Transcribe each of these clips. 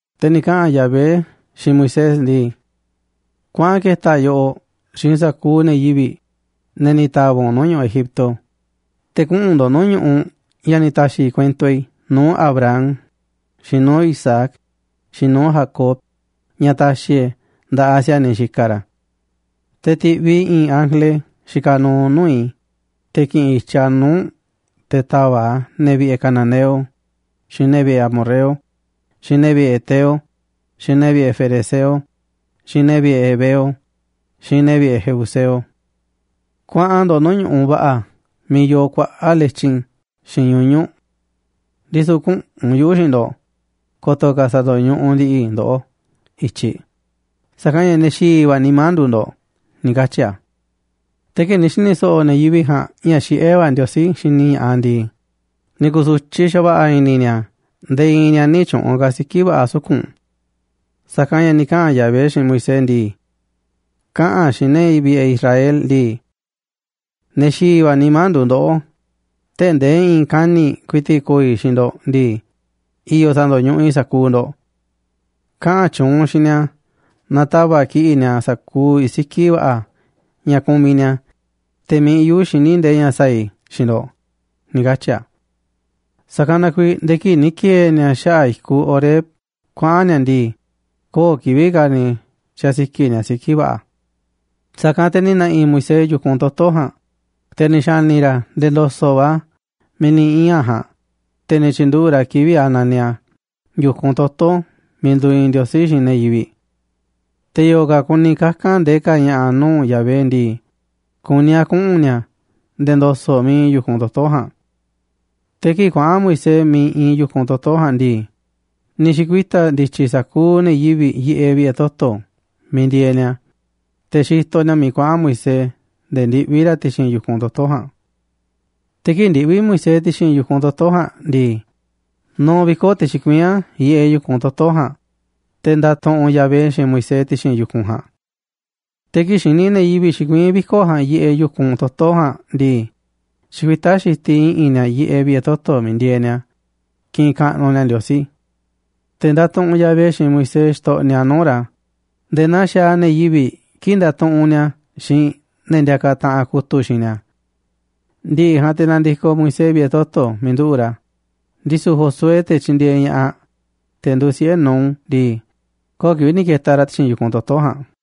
Te̱ ni̱ kaꞌa̱n Yahvé xiinꞌ Moisés ndii: ―Kuaꞌan ke̱ta̱ yoꞌoꞌ xiinꞌ sa̱kuuꞌ ne̱ yivi̱ꞌ, ne̱ ni̱ ta̱va̱ꞌ u̱nꞌ nuu̱ꞌ ñu̱ꞌuꞌ Egipto, te̱ kuꞌu̱n ndo̱ꞌ nuu̱ꞌ ñu̱ꞌuꞌ ña̱ ni̱ ta̱xi̱ kuento i̱ nuu̱ꞌ Abraham, xiinꞌ nuu̱ꞌ Isaac, xiinꞌ nuu̱ꞌ Jacob, ña̱ ta̱xi̱ e̱ꞌ e̱ nda̱ꞌaꞌ si̱a̱niꞌ xikaꞌ ra̱. Te̱ ti̱ꞌviꞌ i̱ i̱i̱n ángele xikaꞌ nuuꞌ nuu̱ꞌ i̱, te̱ ki̱ꞌi̱n i̱tyiꞌ a̱ nuu̱ꞌ u̱nꞌ te̱ ta̱va̱ꞌ a̱ ne̱ vi̱ꞌe̱ cananeo, xiinꞌ ne̱ vi̱ꞌe̱ amorreo, xiinꞌ ne̱ vi̱ꞌe̱ heteo, xiinꞌ ne̱ vi̱ꞌe̱ ferezeo, xiinꞌ ne̱ vi̱ꞌe̱ heveo, xiinꞌ ne̱ vi̱ꞌe̱ jebuseo. Kuaꞌan ndo̱ꞌ nuu̱ꞌ ñu̱ꞌuꞌ va̱ꞌa̱ miiꞌ yoo kuaꞌa̱ꞌ letyin xiinꞌ ñuñu̱ꞌ. Ndisu̱ küꞌu̱n yuꞌu̱ xiinꞌ ndo̱ꞌ, ko̱to̱ ka̱ sa̱ndo̱ñuꞌuꞌ ndi̱ꞌi̱ i̱ ndoꞌó i̱tyiꞌ, sa̱kanꞌ ña̱ ne̱ xi̱i̱ va̱ nimá nduuꞌ ndo̱ꞌ ―ni̱ katyi̱ a̱. Te̱ kii̱ꞌ ni̱ xi̱ni̱ so̱ꞌo̱ ne̱ yivi̱ꞌ ja̱a̱nꞌ ña̱ xiꞌé va̱ Ndiosí xini ña̱ꞌaꞌ a̱ ndii, ni̱ ku̱su̱tyiꞌ xa̱va̱ꞌa̱ i̱ni̱ ni̱a̱ nde̱e̱ i̱i̱n ni̱a̱ nï̱ tyu̱ꞌu̱n ka̱ siki̱ va̱ꞌa̱ suku̱nꞌ. Sa̱kanꞌ ña̱ ni̱ kaꞌa̱n Yahvé xiinꞌ Moisés ndii: “Kaꞌa̱n xiinꞌ ne̱ vi̱ꞌe̱ Israel ndii: ‘Ne̱ xi̱i̱ va̱ nimá nduuꞌ ndoꞌó, tee̱ꞌ ndee i̱i̱n kani̱ꞌ ku̱i̱ti̱ꞌ ko̱o̱ i̱ xiinꞌ ndo̱ꞌ ndii, i̱yo̱ sa̱ndo̱ñuꞌuꞌ i̱ sa̱kuuꞌ ndo̱ꞌ. Kaꞌa̱n tyuunꞌ u̱nꞌ xiinꞌ ni̱a̱ na ta̱va̱ꞌ kiꞌi̱ꞌ ni̱a̱ sa̱kuuꞌ siki̱ va̱ꞌa̱ ña̱ kumiꞌ ni̱a̱, te̱ mi̱iꞌ yuꞌu̱ xiní ndee ña̱ sa̱a̱ i̱ xiinꞌ ndo̱ꞌ”’, ni̱ katyi̱ a̱. Sa̱kanꞌ na kuiiꞌ nde̱e̱ kii̱ꞌ ni̱ ki̱e̱e̱ ni̱a̱ xaꞌa̱ꞌ i̱kuꞌ Horeb kuaꞌa̱n ni̱a̱ ndii, köo̱ꞌ kivi̱ꞌ ka̱ ni̱ xasiki̱ꞌ ni̱a̱ siki̱ va̱ꞌa̱. Sa̱kanꞌ te̱ ni̱ na̱ꞌi̱ Moisés yu̱kunꞌ toto̱ ja̱a̱nꞌ, te̱ ni̱ xa̱ni̱ ra̱ a̱ nde̱e̱ ndo̱so̱ꞌ va̱ miiꞌ ni̱ ii̱n a̱ ja̱a̱nꞌ, te̱ ni̱ tyi̱nduꞌu̱ꞌ ra̱ kivi̱ꞌ a̱ naniꞌ a̱ yu̱kunꞌ toto̱ miiꞌ nduuꞌ iinꞌ Ndiosí xiinꞌ ne̱ yivi̱ꞌ. Te̱ yo̱o̱ ka̱ kuni kaka̱n ndee ka̱ ña̱ꞌa̱ nuu̱ꞌ Yahvé ndii, kuní a̱ kuꞌu̱n ni̱a̱ nde̱e̱ ndo̱so̱ꞌ miiꞌ iinꞌ yu̱kunꞌ toto̱ ja̱a̱nꞌ. Te̱ kii̱ꞌ kuaꞌa̱n Moisés miiꞌ iinꞌ yu̱kunꞌ toto̱ ja̱a̱nꞌ ndii, ni̱ xi̱kuita̱ ndi̱tyi̱ sa̱kuuꞌ ne̱ yivi̱ꞌ yiꞌeꞌ vi̱ꞌe̱ toto̱ miiꞌ ndieeꞌ ni̱a̱, te̱ xitoꞌ ni̱a̱ miiꞌ kuaꞌa̱n Moisés nde̱e̱ ndiꞌví ra̱ ti̱xi̱n yu̱kunꞌ toto̱ ja̱a̱nꞌ. Te̱ kii̱ꞌ ndiꞌví Moisés ti̱xi̱n yu̱kunꞌ toto̱ ja̱a̱nꞌ ndii, nuuꞌ viko̱ꞌ te̱ xikuiín a̱ yiꞌeꞌ yu̱kunꞌ toto̱ ja̱a̱nꞌ, te̱ ndatuꞌunꞌ Yahvé xiinꞌ Moisés ti̱xi̱n yu̱kunꞌ ja̱a̱nꞌ. Te̱ kii̱ꞌ xini ne̱ yivi̱ꞌ xikuiín viko̱ꞌ ja̱a̱nꞌ yiꞌeꞌ yu̱kunꞌ toto̱ ja̱a̱nꞌ ndii, xikuitá xitiꞌ i̱ꞌi̱n ni̱a̱ yiꞌeꞌ vi̱ꞌe̱ toto̱ miiꞌ ndieeꞌ ni̱a̱ kiꞌinꞌ kaꞌnuꞌ ni̱a̱ Ndiosí. Te̱ ndatuꞌunꞌ Yahvé xiinꞌ Moisés xitoꞌniꞌ a̱ nuu̱ꞌ ra̱ nde̱e̱ naa xaaꞌ ne̱ yivi̱ꞌ kii̱ꞌ ndatuꞌunꞌ ni̱a̱ xiinꞌ i̱i̱n ne̱ ndiakaꞌ taꞌanꞌ kutu̱ꞌ xiinꞌ ni̱a̱. Ndi̱ꞌi̱ ja̱a̱nꞌ te̱ nandikoꞌ Moisés vi̱ꞌe̱ toto̱ miiꞌ nduꞌu̱ꞌ ra̱, ndisu̱ Josué, te̱ tyindieeꞌ ña̱ꞌaꞌ, te̱ nduuꞌ siꞌe̱ Nun ndii, köo̱ꞌ kivi̱ꞌ ni̱ ke̱ta̱ ra̱ ti̱xi̱n yu̱kunꞌ toto̱ ja̱a̱nꞌ.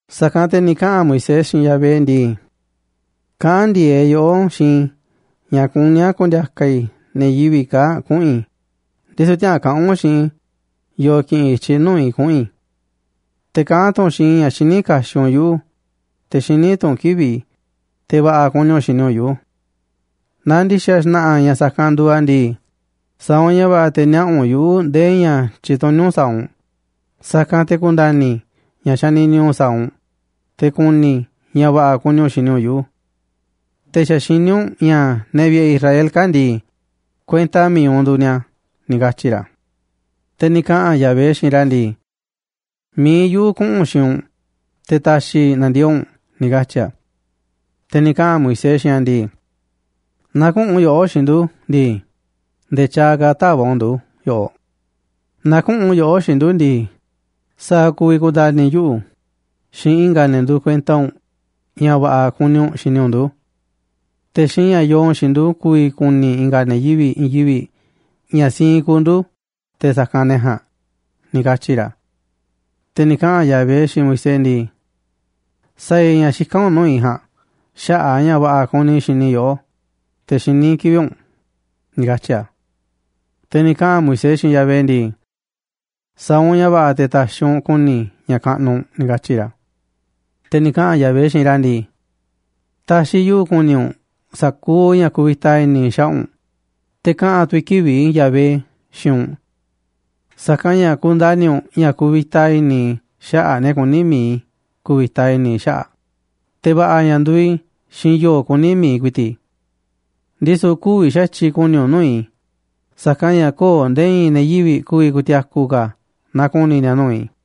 Sa̱kanꞌ te̱ ni̱ kaꞌa̱n Moisés xiinꞌ Yahvé ndii: ―Kaꞌán ndi̱e̱eꞌ yoꞌó xiinꞌ i̱ ña̱ kuní a̱ ku̱ndi̱a̱ka̱ i̱ ne̱ yivi̱ꞌ kaa̱ꞌ kuꞌu̱n i̱, ndisu̱ tiäꞌa̱an kaꞌa̱n u̱nꞌ xiinꞌ i̱ yo̱o̱ ki̱ꞌi̱n i̱tyiꞌ nuu̱ꞌ i̱ kuꞌu̱n i̱. Te̱ kaꞌán tu̱ u̱nꞌ xiinꞌ i̱ ña̱ xiní kaxiꞌ u̱nꞌ yuꞌu̱, te̱ xiní tu̱ u̱nꞌ kivi̱ꞌ i̱, te̱ va̱ꞌa̱ kuni u̱nꞌ xini u̱nꞌ yuꞌu̱. Naaꞌ ndi̱xa̱ xna̱ꞌa̱ ña̱ sa̱kanꞌ nduuꞌ a̱ ndii, sa̱a̱ u̱nꞌ ña̱ va̱ꞌa̱ te̱ niaꞌa̱ u̱nꞌ yuꞌu̱ ndee ña̱ tyituní u̱nꞌ sa̱a̱ u̱nꞌ. Sa̱kanꞌ te̱ ku̱nda̱ni̱ i̱ ña̱ xanini u̱nꞌ sa̱a̱ u̱nꞌ, te̱ ku̱ni̱ i̱ ña̱ va̱ꞌa̱ kuni u̱nꞌ xini u̱nꞌ yuꞌu̱. Te̱ xa̱ xiní u̱nꞌ ña̱ ne̱ vi̱ꞌe̱ i̱ Israel kaa̱ꞌ ndii, kuenta mi̱iꞌ u̱nꞌ nduuꞌ ni̱a̱ ―ni̱ katyi̱ ra̱. Te̱ ni̱ kaꞌa̱n Yahvé xiinꞌ ra̱ ndii: ―Mi̱iꞌ yuꞌu̱ kuꞌu̱n xiinꞌ u̱nꞌ, te̱ ta̱xi̱ i̱ na̱ndiee̱ꞌ u̱nꞌ ―ni̱ katyi̱ a̱. Te̱ ni̱ kaꞌa̱n Moisés xiinꞌ a̱ ndii: ―Naaꞌ küꞌu̱n yoꞌó xiinꞌ ndu̱ ndii, nde̱e̱ tyaaꞌ ka̱ tä̱va̱ꞌ u̱nꞌ ndu̱ yoꞌoꞌ. Naaꞌ küꞌu̱n yoꞌó xiinꞌ ndu̱ ndii, ¿sa̱a̱ ku̱vi̱ ku̱nda̱ni̱ yuꞌu̱ xiinꞌ i̱nga̱ ne̱ nduuꞌ kuenta u̱nꞌ ña̱ va̱ꞌa̱ ka̱ kuni u̱nꞌ xini u̱nꞌ ndu̱? Te̱ xiinꞌ ña̱ yoo u̱nꞌ xiinꞌ ndu̱ ku̱vi̱ ku̱ni̱ i̱nga̱ ne̱ yivi̱ꞌ i̱i̱n yivi̱ꞌ ña̱ siinꞌ kuuꞌ ndu̱ te̱ sa̱kanꞌ ne̱ ja̱a̱nꞌ ―ni̱ katyi̱ ra̱. Te̱ ni̱ kaꞌa̱n Yahvé xiinꞌ Moisés ndii: ―Sa̱a̱ i̱ ña̱ xikán u̱nꞌ nuu̱ꞌ i̱ ja̱a̱nꞌ xaꞌa̱ꞌ a̱ ña̱ va̱ꞌa̱ kuni i̱ xini i̱ yoꞌó, te̱ xiní i̱ kivi̱ꞌ u̱nꞌ ―ni̱ katyi̱ a̱. Te̱ ni̱ kaꞌa̱n Moisés xiinꞌ Yahvé ndii: ―Sa̱a̱ u̱nꞌ ña̱ va̱ꞌa̱ te̱ ta̱xi̱ u̱nꞌ ku̱ni̱ i̱ ña̱ kaꞌnuꞌ u̱nꞌ ―ni̱ katyi̱ ra̱. Te̱ ni̱ kaꞌa̱n Yahvé xiinꞌ ra̱ ndii: ―Ta̱xi̱ yuꞌu̱ ku̱ni̱ u̱nꞌ sa̱kuuꞌ ña̱ kuvita i̱ni̱ i̱ xaꞌa̱ꞌ u̱nꞌ, te̱ kaꞌa̱n tu̱ i̱ kivi̱ꞌ i̱, Yahvé, xiinꞌ u̱nꞌ. Sa̱kanꞌ ña̱ ku̱nda̱ni̱ u̱nꞌ ña̱ kuvita i̱ni̱ i̱ xaꞌa̱ꞌ ne̱ kuní mi̱iꞌ i̱ ku̱vi̱ta i̱ni̱ i̱ xaꞌa̱ꞌ, te̱ va̱ꞌa̱ ña̱ nduuꞌ i̱ xiinꞌ yo̱o̱ kuní mi̱iꞌ ku̱i̱ti̱ꞌ i̱. Ndisu̱ kü̱vi̱ xa̱tyiꞌ ku̱ni̱ u̱nꞌ nuu̱ꞌ i̱, sa̱kanꞌ ña̱ köo̱ꞌ nde̱e̱ i̱i̱n ne̱ yivi̱ꞌ ku̱vi̱ ku̱ti̱a̱ku̱ ka̱ naaꞌ ku̱ni̱ ni̱a̱ nuu̱ꞌ i̱.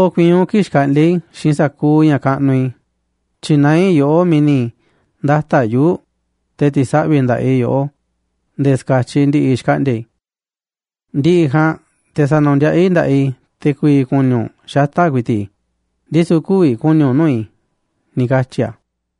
kii̱ꞌ xkaꞌndi̱a̱ i̱ xiinꞌ sa̱kuuꞌ ña̱ kaꞌnuꞌ i̱, tyi̱naá i̱ yoꞌó miiꞌ ni̱ ndata̱ꞌ yuu̱ꞌ, te̱ ti̱saꞌvi̱ nda̱ꞌaꞌ i̱ yoꞌó nde̱e̱ ska̱tyiꞌ ndi̱ꞌi̱ xkaꞌndi̱a̱ i̱. Ndi̱ꞌi̱ ja̱a̱nꞌ te̱ sa̱nu̱ndiaꞌá i̱ nda̱ꞌaꞌ i̱, te̱ ku̱vi̱ ku̱ni̱ u̱nꞌ xata̱ꞌ ku̱i̱ti̱ꞌ i̱, ndisu̱ kü̱vi̱ ku̱ni̱ u̱nꞌ nuu̱ꞌ i̱ ―ni̱ katyi̱ a̱.